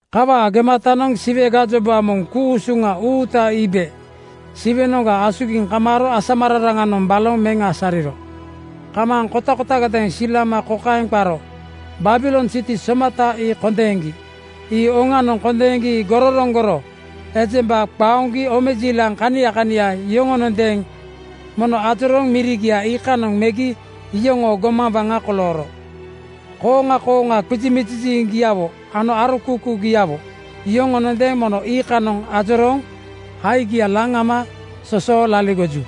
Kawaa gematanoŋ Siwe gajoba moŋ ku-usuŋa uuta iibe Siwenoŋga asugiŋ kamaaro asamararaŋanoŋ baloŋ meŋ asariro. Kamaaŋ kotakotagadeeŋ silama kokaeŋ qaro, “Babilon siti somata ii kondeeŋgi. Ii oŋanoŋ kondeeŋgi gororoŋgoro. Ejemba qaoŋgi omejiilaŋ kania kania yoŋonondeeŋ mono ajorooŋ mirigia iikanoŋ megi iyoŋoo gomaŋ waŋa kolooro. Kooŋa kooŋa qizimiziŋgiawo ano arokuukuugiawo yoŋonondeeŋ mono iikanoŋ ajorooŋ haigia laŋ ama sosoo laligoju.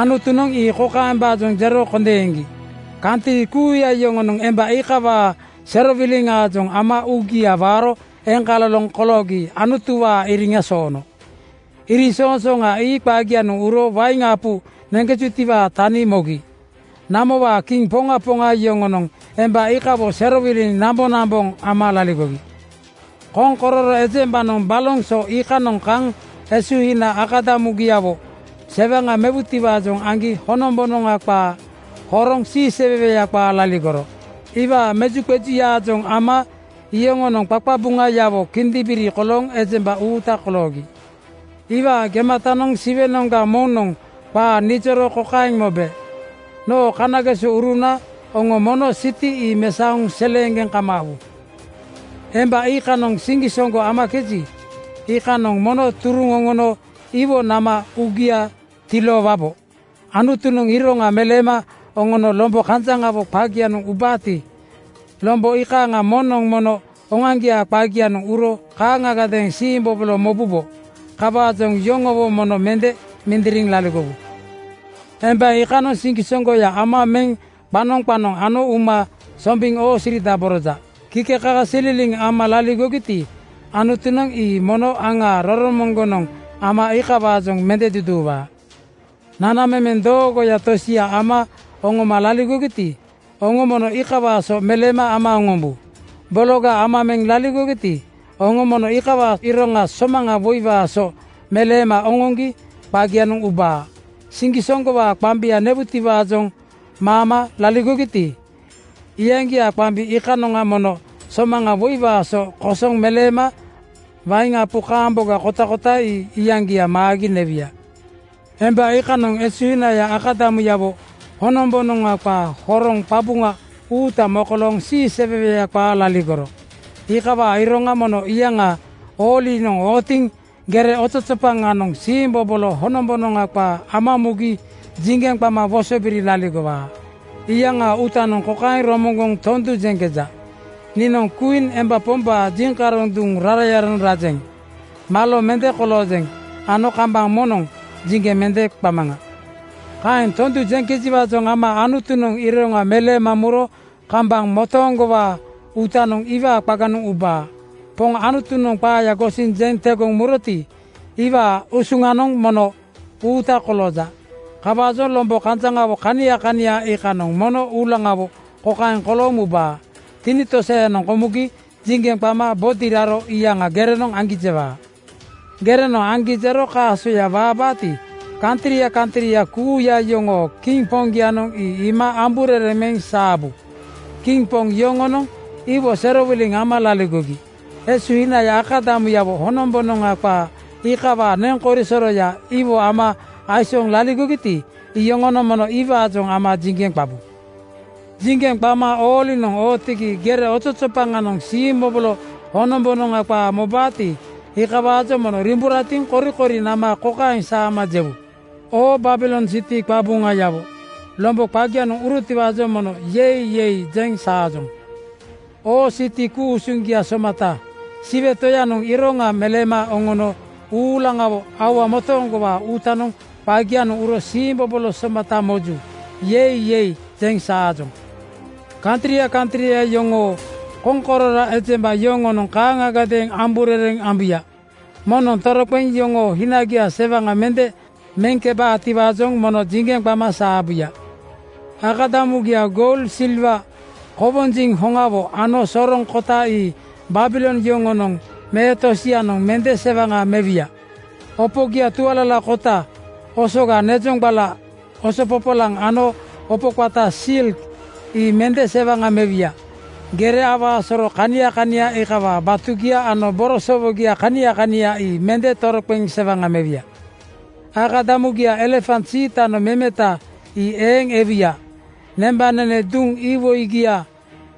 “Anutunoŋ ii kokaembaajoŋ jero kondeeŋgi: Kantri kuuya yoŋonoŋ emba iikawaa serowiliŋaajoŋ ama uugia waaro eŋkaloloŋ koloogi Anutuwaa iriŋa soono. Iriŋsoŋsooŋa ii qagianoŋ uro wain apu neŋkejutiwaa tani mogi. Namowaa kiŋ poŋa poŋa yoŋonoŋ emba iikawo serowiliŋ namboŋnamboŋ ama laligogi. Koŋkororo ejembanoŋ baloŋ so iikanoŋa kaŋ esuhina akadamugiawo sewaŋa mewaatiwaajoŋ aŋgi honombonoŋa qaa horoŋ siiseweweya qaa laligoro. Iwaa mejuqejuyaajoŋ ama yoŋonoŋ qaqabuŋayawo kindimbiri kolooŋ ejemba uuta koloogi.” Iikawaa gematanoŋ Siwenoŋga moŋnoŋ qaa nijoro kokaeŋ mobe, “Noo kanagesouruna, oŋo mono siti ii mesaoŋ seleeŋgeŋ kamaawu. Emba iikanoŋ siŋgisoŋgo amakeji, iikanoŋ mono turuŋ oŋono iwo nama uugia tiloowubo. Anutunoŋ iroŋa meleema oŋono lombo kanjaŋawo qagianoŋ ubaati, lombo iikaaŋa moŋnoŋ mono oŋoaŋgiaa qagianoŋ uro kaaŋagadeeŋ siimbobolo mobubo. Kawaajoŋ yoŋowo mono mende mindiriŋ laligowu. Emba iikanoŋ siŋgisoŋgoya ama meŋ qanoŋ qanoŋ ano uma sombiŋ oosiridaboroja. Kikekakasililiŋ ama laligogiti, Anutunoŋ ii mono aŋaa roromoŋgonoŋ ama iikawaajoŋ mende duduuwaa. Nanamemeŋ doogoya tosia ama oŋoma laligogiti, oŋo mono iikawaa so meleema ama oŋombu. Bologa ama meŋ laligogiti, oŋo mono iikawaa iroŋa somaŋa woiwaa so meleema oŋoŋgi qagianoŋ ubaa. Siŋgisoŋgowaa qambia newutiwaajoŋ maama laligogiti, iyaŋgiaa qambi iikanoŋa mono somaŋ woiwaa so kosoŋ meleema wain apu kaamboga kotakota ii iyaŋgia maagi newuya. Emba iikanoŋ esuhina akadamuyawo honombonoŋa qaa horoŋ qabuŋa uuta mokolooŋ siiseweweya qaa laligoro. Iikawaa iroŋa mono iyaŋaa oolinoŋ ootiŋ gere ozozopaŋanoŋ siimbobolo honombonoŋa qaa ama mugi jiŋgeŋ qama wosobiri laligowaa. Iyaŋaa uutanoŋ kokaeŋ romoŋgoŋ tondu jeŋkeja, ‘Niinoŋ kwiin emba pombaa jiŋkaroŋ duŋ rarayanoŋ rajeŋ. Malo mende koloojeŋ ano kambaŋ moŋnoŋ jiŋgeŋ mende qamaŋa.’ Kaeŋ tondu jeŋkejiwaajoŋ ama Anutunoŋ iroŋa meleema muro kambaŋ motooŋgowaa uutanoŋ iwaa qaganoŋ ubaa. Poŋ Anutunoŋ qaaya gosiŋ jeŋ tegoŋ muroti, iwaa usuŋanoŋ mono uuta kolooja. Kawaajoŋ lombo kanjaŋawo kania kania iikanoŋ mono uulaŋawo kokaeŋ kolooŋ mubaa: Tinitosayanoŋ komugi jiŋgeŋ qama bodi raro iyaŋa gerenoŋ aŋgi jewaa.” Gerenoŋ aŋgi jero kaaso waabaati, kantria kantria kuuya yoŋoo kiŋ poŋgianoŋ ii iima amburereŋ meŋ saabu. Kiŋ poŋ yoŋonoŋ iwo serowiliŋ ama laligogi. Esuhinaya akadamugiawo honombonoŋa qaa iikawaa neŋ korisoroya iwo ama aisooŋ laligogiti, iyoŋonoŋ mono iwaajoŋ ama jiŋgeŋ qabu. Jiŋgeŋ qama oolinoŋ ootigi gere ozozopaŋanoŋ siimbobolo honombonoŋa qaa mobaati, iikawaajoŋ mono riimburatiŋ korikori nama kokaeŋ saama jewu, “Oo Babilon siti qabuŋayawo, lombo qagianoŋ urotiwaajoŋ mono ‘Yei! Yei!’ jeŋ saajoŋ. Oo siti ku-usuŋgia somata, Siwe Toyanoŋ iroŋa meleema oŋono uulaŋawo aua motooŋgowaa uutanoŋ qagianoŋ uro siimbobolo somata moju. ‘Yei! Yei!’ jeŋ saajoŋ!” Kantria kantria yoŋoo koŋkororo ejemba yoŋonoŋ kaaŋagadeeŋ amburereŋ ambuya. Moŋnoŋ toroqeŋ yoŋoo hinagia sewaŋa mende meŋkebaatiwaajoŋ mono jiŋgeŋ qama saabuya. Akadamugia goul, silwa, kowonjiŋ hoŋawo ano soroŋ kota ii Babilon yoŋonoŋ me tosianoŋ mende sewaŋa mewuya. Opogia tualalakota, osoga nezoŋgbala, oso popolaŋ ano opo qata silk ii mende sewaŋa mewuya. Gere awaa soro kania kania iikawaa batugia ano borosowogia kania kania ii mende toroqeŋ sewaŋa mewuya. Akadamugia elefant siitanoŋ memeta, ii eeŋ ewuya. Nembanene duŋ iwoigia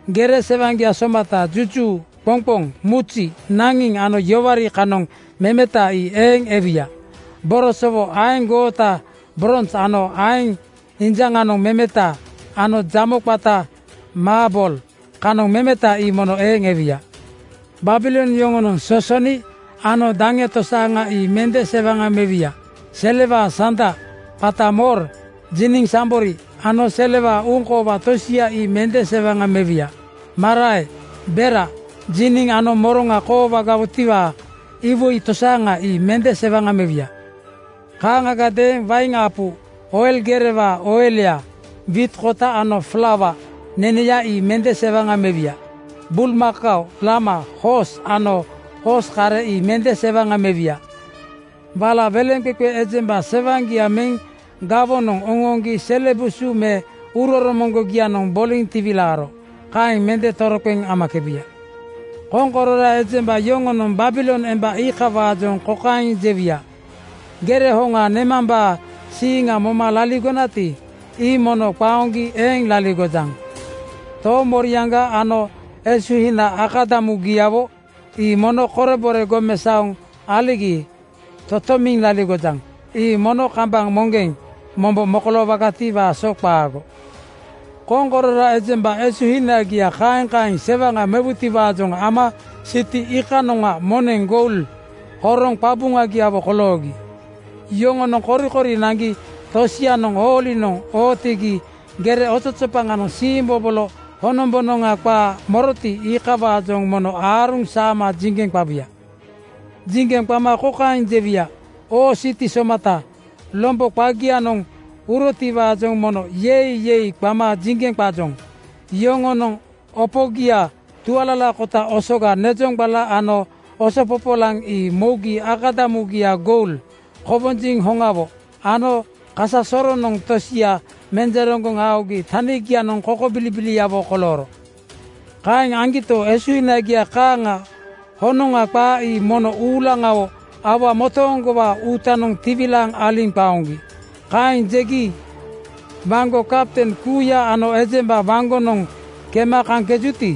gere sewaŋgia somata juju, qoŋqoŋ, muzi, naŋiŋ ano yoware kanoŋ memeta, ii eeŋ ewuya. Borosowo aeŋ goota brons ano aeŋ injaŋanoŋ memeta ano jamo qata maabol kanoŋ memeta ii mono eeŋ ewuya. Babilon yoŋonoŋ sosoni (sinamon) ano daŋe tosaaŋa ii mende sewaŋa mewuya. Selewaa sanda qata mor, jiniŋ sambori ano selewaa uŋkoowa tosia ii mende sewaŋa mewuya. Marae, bera, jiniŋ ano moroŋa koloowaatiwaa iwoi tosaaŋa ii mende sewaŋa mewuya. Kaaŋagadeeŋ wain apu, oil gerewaa oilya, wiit kota ano flaua neneya ii mende sewaŋa mewuya. Bulmakao, lama, hoos ano hoos kare ii mende sewaŋa mewuya. Wala weleŋqeqe ejemba sewaŋgia meŋ gawonoŋ oŋooŋgi sele busu me uuroromoŋgogianoŋ boliŋ tiwilaaro. Kaeŋ mende toroqeŋ amakebuya. Koŋkororo ejemba yoŋonoŋ Babilon emba iikawaajoŋ kokaeŋ jewuya, “Gere hoŋa nemambaa siiŋ moma laligonati, ii mono qaoŋgi eeŋ laligojaŋ. Toomoriaŋga ano esuhinaga akadamugiawo ii mono korebore gomesaoŋ aligi totomiŋ laligojaŋ. Ii mono kambaŋ moŋgeŋ mombo mokoloowagatiwaa so qaago.” Koŋkororo ejemba esuhinagia kaeŋ kaeŋ sewaŋa mewutiwaajoŋ ama siti iikanoŋa moneŋ goul (maa suaŋ) horoŋ qabuŋagiawo koloogi. Yoŋonoŋ korikori naŋgi tosianoŋ oolinoŋ ootigi gere ozozopaŋanoŋ siimbobolo honombonoŋa qaa moroti, iikawaajoŋ mono aaruŋ saama jiŋgeŋ qabuya. Jiŋgeŋ qama kokaeŋ jewuya, “Oo siti somata, lombo qagianoŋ urotiwaajoŋ mono ‘Yei! Yei!’ qama jiŋgeŋ qajoŋ. Yoŋonoŋ opogia tualalakota, osoga nezoŋgbala ano oso popolaŋ ii mougi. Akadamugia goul, kowonjiŋ hoŋawo ano kasasoroŋ tosianoŋ menjereŋgoŋ aogi tanigianoŋ kokobilibiliawo kolooro. Kaeŋ aŋgito, esuhinagia kaaŋa honoŋa qaa ii mono uulaŋawo aua motooŋgowaa uutanoŋ tiwilaaŋ aliŋ qaoŋgi.” Kaeŋ jegi. Waŋgo kapten kuuya ano ejemba waŋgonoŋ kema kaŋkejuti,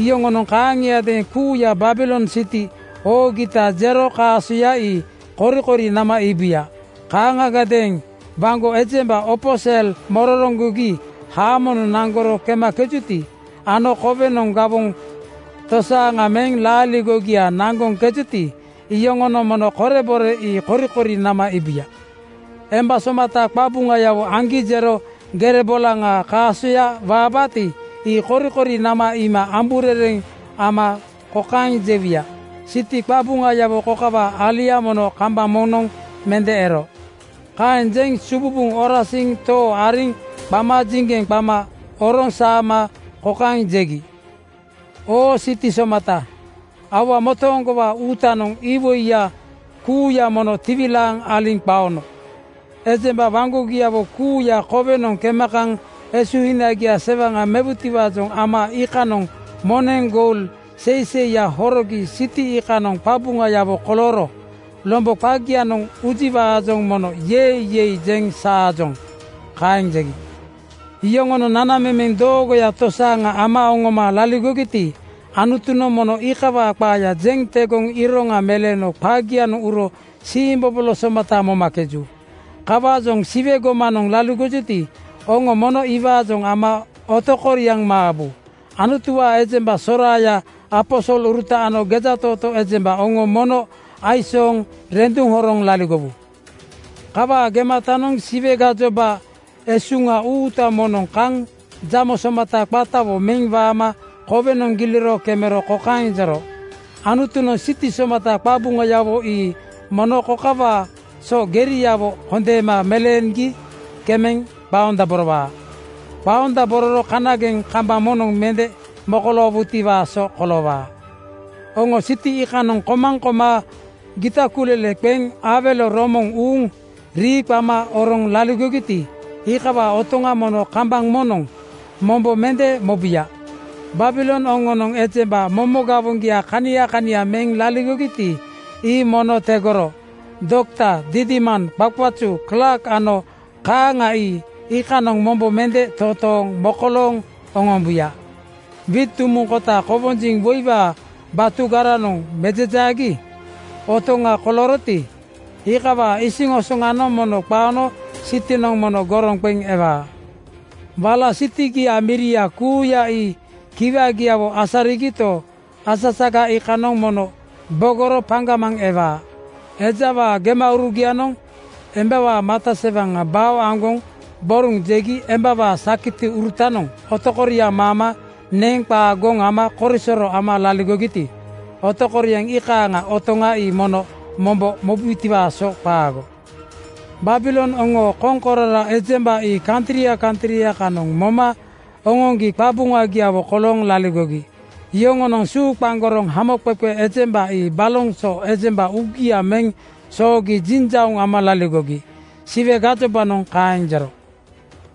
iyoŋonoŋ kaaŋiadeeŋ kuuya Babilon siti oogita jero kaasoya ii korikori nama iibuya. Kaaŋagadeeŋ waŋgo ejemba opo sel mororoŋgogi haamonoŋ naŋgoro kemakejuti ano kowenoŋ gawoŋ tosaaŋa meŋ laaligogia naŋgoŋkejuti, iyoŋonoŋ mono korebore ii korikori nama iibuya. Emba somata qabuŋayawo aŋgi jero gere bolaŋaa kaasoya waabaati, ii korikori nama iima amburereŋ ama kokaeŋ jewuya, “Siti qabuŋayawo kokawaa alia mono kambaŋ moŋnoŋ mende ero.” Kaeŋ jeŋ sububuŋ orasiŋ too ariŋ qama jiŋgeŋ qama oroŋ saama kokaeŋ jegi, “Oo siti somata, aua motooŋgowaa uutanoŋ iwoiya kuuya mono tiwilaaŋ aliŋ qaono. Ejemba waŋgogiawo kuuya kowenoŋ kema kaŋ esuhinagia sewaŋa mewutiwaajoŋ ama iikanoŋa moneŋ goul (maa suaŋ) seiseiya horogi siti iikanoŋ qabuŋayawo kolooro. Lombo qagianoŋ ujiwaajoŋ mono ‘Yei! Yei!’ jeŋ saajoŋ.” Kaeŋ jegi. Yoŋonoŋ nanamemeŋ doogoya tosaaŋa ama oŋoma laligogiti, Anutunoŋ mono iikawaa qaaya jeŋ tegoŋ iroŋa meleeno qagianoŋ uro siimbobolo somata momakeju. Kawaajoŋ Siwe gomanoŋ laligojuti, oŋo mono iwaajoŋ ama otokoriaŋ maabu. Anutuwaa ejemba soraaya, aposoluruta ano gejatootoo ejemba oŋo mono aisooŋ renduŋ horoŋ laligowu. Kawaa gematanoŋ Siwe gajoba esuŋa uuta moŋnoŋ kaŋ jamo somata qatawo meŋ waama kowenoŋ giliro kemero kokaeŋ jero, “Anutunoŋ siti somata qabuŋayawo ii mono kokawaa so geriawo kondeema meleeŋgi kemeŋ qaondaborowaa. Qaondabororo kanageŋ kambaŋ moŋnoŋ mende mokoloowutiwaa so koloowaa. Oŋo siti iikanoŋ komaŋ koma gita kulele qeŋ awelo romoŋ uuŋ rii qama oroŋ laligogiti, iikawaa otoŋa mono kambaŋ moŋnoŋ mombo mende mobuya. Babilon oŋoonoŋ ejemba momo gawoŋgia kania kania meŋ laligogiti, ii mono tegoro. Dokta didiman, qaqazu klaak ano kaaŋa ii iikanoŋ mombo mende totooŋ mokolooŋ oŋombuya. Wiit dumuŋ kota kowonjiŋ woiwaa batugaranoŋ mejejaagi (mill) otoŋa kolooroti, iikawaa isiŋosoŋanoŋ mono qaono sitinoŋ mono goroŋ qeŋ ewaa. “Wala sitigiaa miria kuuya ii kiwagiawo asarigito, asasaga iikanoŋ mono bogoro paŋgamaŋ ewaa. Ejawaa gemaurugianoŋ embawaa mata sewaŋa bao aŋgoŋ boruŋ jegi embawaa sakitiurutanoŋ otokoriaŋ maama neŋ qaa goŋ ama korisoro ama laligogiti, otokoriaŋ iikaaŋaa otoŋa ii mono mombo mobutiwaa so qaago. Babilon oŋoo koŋkororo ejemba ii kantria kantria kanoŋ moma oŋoŋgi qabuŋagiawo kolooŋ laligogi. Yoŋoonoŋ suuqaŋgoroŋ hamoqeqe ejemba ii baloŋ so ejemba uugia meŋ soogi jiŋjauŋ ama laligogi.” Siwe gajobanoŋ kaeŋ jero.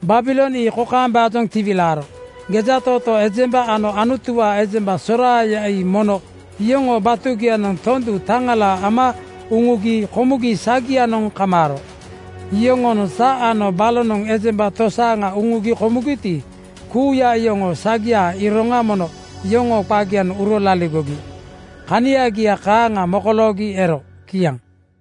Babilon ii kokaembaajoŋ tiwilaaro: Gejatootoo ejemba ano Anutuwaa ejemba soraaya ii mono yoŋoo batugianoŋ tondu taŋala ama uŋugi komugi sagianoŋ kamaaro. Yoŋoonoŋ sa ano balonoŋ ejemba tosaaŋa uŋugi komugiti, kuuya iyoŋoo sagiaa iroŋanoŋ mono yoŋoo qagianoŋ uro laligogi. Kaniagia kaaŋa mokoloogi ero. Kiaŋ